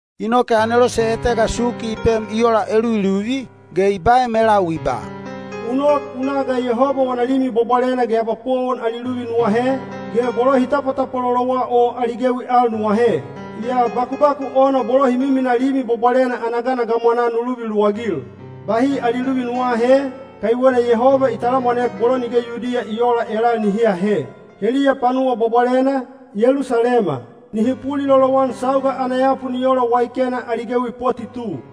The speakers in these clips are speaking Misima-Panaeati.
Inoke anelose etega suki i pem i ola eluviluvi, ge i baem elau i ba, “U nok u na ga Yehoba wana Limi Bwabwalena ge abapowon ali luvi nu ahe, ge bolo hi tapwatapwalolowa o ali gewi al nu ahe. Yaa bakubaku ona bolo hi miminaa Limi Bwabwalena ana gana gamwanaa nu luvi luwagil. Bahi ali luvi nu aahe, kaiwena Yehoba i talamwanek bolo nige Yudiya i oola elal nihi ahe. Heliya panuwa bwabwalena, Yelusalema, nihi pulilolowan sauga ana yapu ni ola waikena ali gewi poti tu.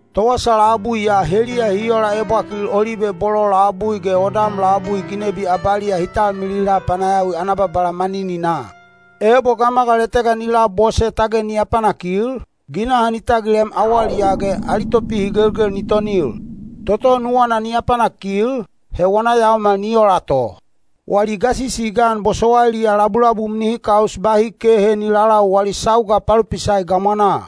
Towasa labui ya heliya hi ola ebwakil olibe bolo labui ge odam labui ginebi abaliya hi talmilila panayawi ana Babala manininaa. Ebo gamagal etega ni labose tage ni apanakil, ginaha ni tagilem awaliyaa ge ali topihigelgel ni tonil. Toto nuwana ni apanakil, he wana yaomal ni ola to. Wali gasisi i gan bosowailiya labulabum nihi kaus bahi kehe ni lalau wali sauga palopisai gamwanaa.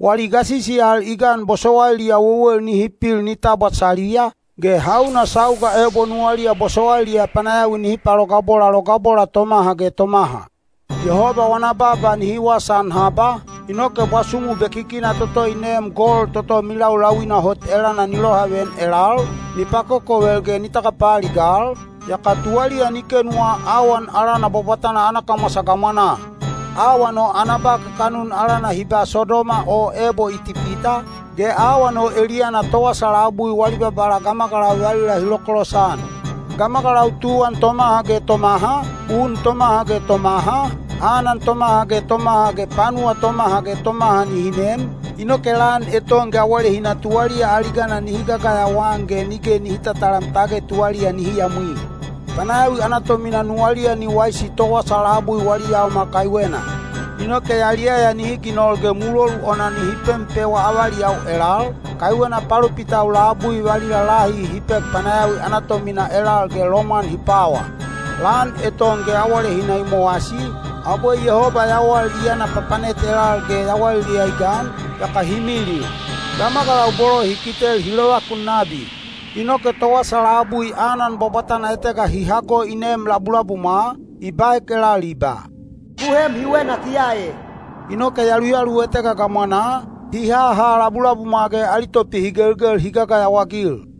Wali gasisi al i gan bosowailiya wewel nihi pil nihi tabwa saliya, ge hauna sauga ebo nuwaliya bosowailiya panayawi nihi palogabola logabola tomaha ge tomaha. Yehoba wana baaba nihi wasaan haba, inoke bwasumu bekikina toto i neem gol toto milaulauina hot elana ni lohaveyan elal, ni pakokovel ge ni tagapaaligal, yaka tuwaliya ni kenuwa awan alana bwabwatana ana kamwasa gamwanaa. Awan o ana ba kakanun alana hi ba Sodoma o ebo Itipita, ge awan o eliyana towasa labui wali Babala gamagalau valila hi lokolosan. Gamagalau tuwan tomaha ge tomaha, un tomaha ge tomaha, anan tomaha ge tomaha ge panuwa tomaha ge tomaha nihi nem, inoke lan eton ge awalehina tuwaliya aligana nihi gagayawa-an ge nige nihi tatalam tage tuwaliya nihi yamwi. Panayawi ana tomina nuwaliya ni waisi towasa labui wali yaomal kaiwena. Inoke yaliyaya nihi ginol ge mulolu ona nihi pempewa avaliyau elal, kaiwena palopitau labui valila lahi hi pek panayawi ana tomina elal ge lomwan hi pwawa. Lan eton ge awalehina i mowasi, abwe Yehoba yawal i yana papanet elal ge yawaliliya i gan, yaka hi milil. Gamagalau bolo hi kitel hi lovakun nabi. Inoke towasa labui anan bwabwatana etega hi hago i neem labulabumwa, i baek elal i ba, “Ku heem hiwe natiya e.” Inoke yaluyalu etega gamwanaa, hi haha labulabumwa ge ali topihigelgel hi gagayawa-agil.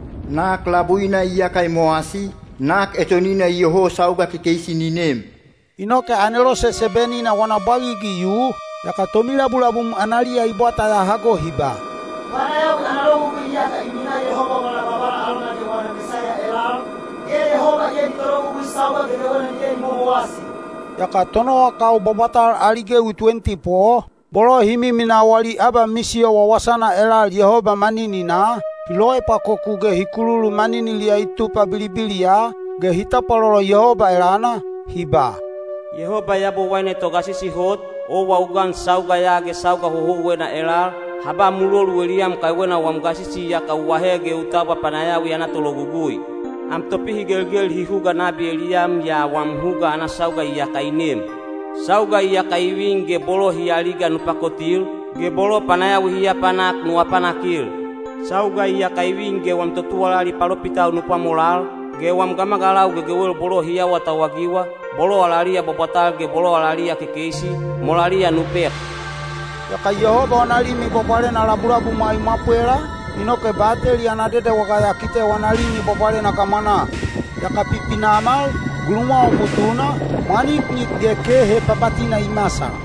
Nak labuina iyaka i mowasi, nak etonina iyoho sauga kekeisi ni nem. Inoke anelose seben-ina wana bwagigi i yu, yaka tomilabulabum analiya i bwata ya hago hi ba, “Panayawi ana logugui iyaka i minaa Yehoba wala Babala alona ge wana Mesaiya elal, ge Yehoba iya ni tologugui sauga gegewena nige ni momowasi.” Yaka tonowakau bwabwatal ali gewi tuwenti po, bolo hi miminaa wali abamisiyo wawasana elal Yehoba manininaa, hi loepwakoku ge hi kululu maniniliya i tupa bilibiliya, ge hi tapwalolo Yehoba elana, hi ba: “Yehoba Yabowaine Togasisi Hot, owa u gan sauga ya ge sauga houhouwena elal, ha ba mulolu eliyam kaiwena wam gasisi iyaka u ahe ge u tabwa panayawi ana tologugui. Am topihigelgel hi huga nabi eliyam yaa wam huga ana sauga iyaka i nem. Sauga iyaka i vin ge bolo hi aliga nu pakotil, ge bolo panayawi hi apanak nu apanakil. Sauga iyaka i vin ge wam totuwalali palopitau nu pwamolal, ge wam gamagalau gegewel bolo hi awatauwagiwa, bolo alaliya bwabwatal ge bolo alaliya kekeisi, molaliya nu pek.” Yaka Yehoba wana Limi Bwabwalena labulabumwa i mwapwela, inoke Bateli ana Dedewaga ya kite wana Limi Bwabwalena gamwanaa. Yaka pipinamal, gulumwawa butuna, mwaniknik ge kehe papatina i masal.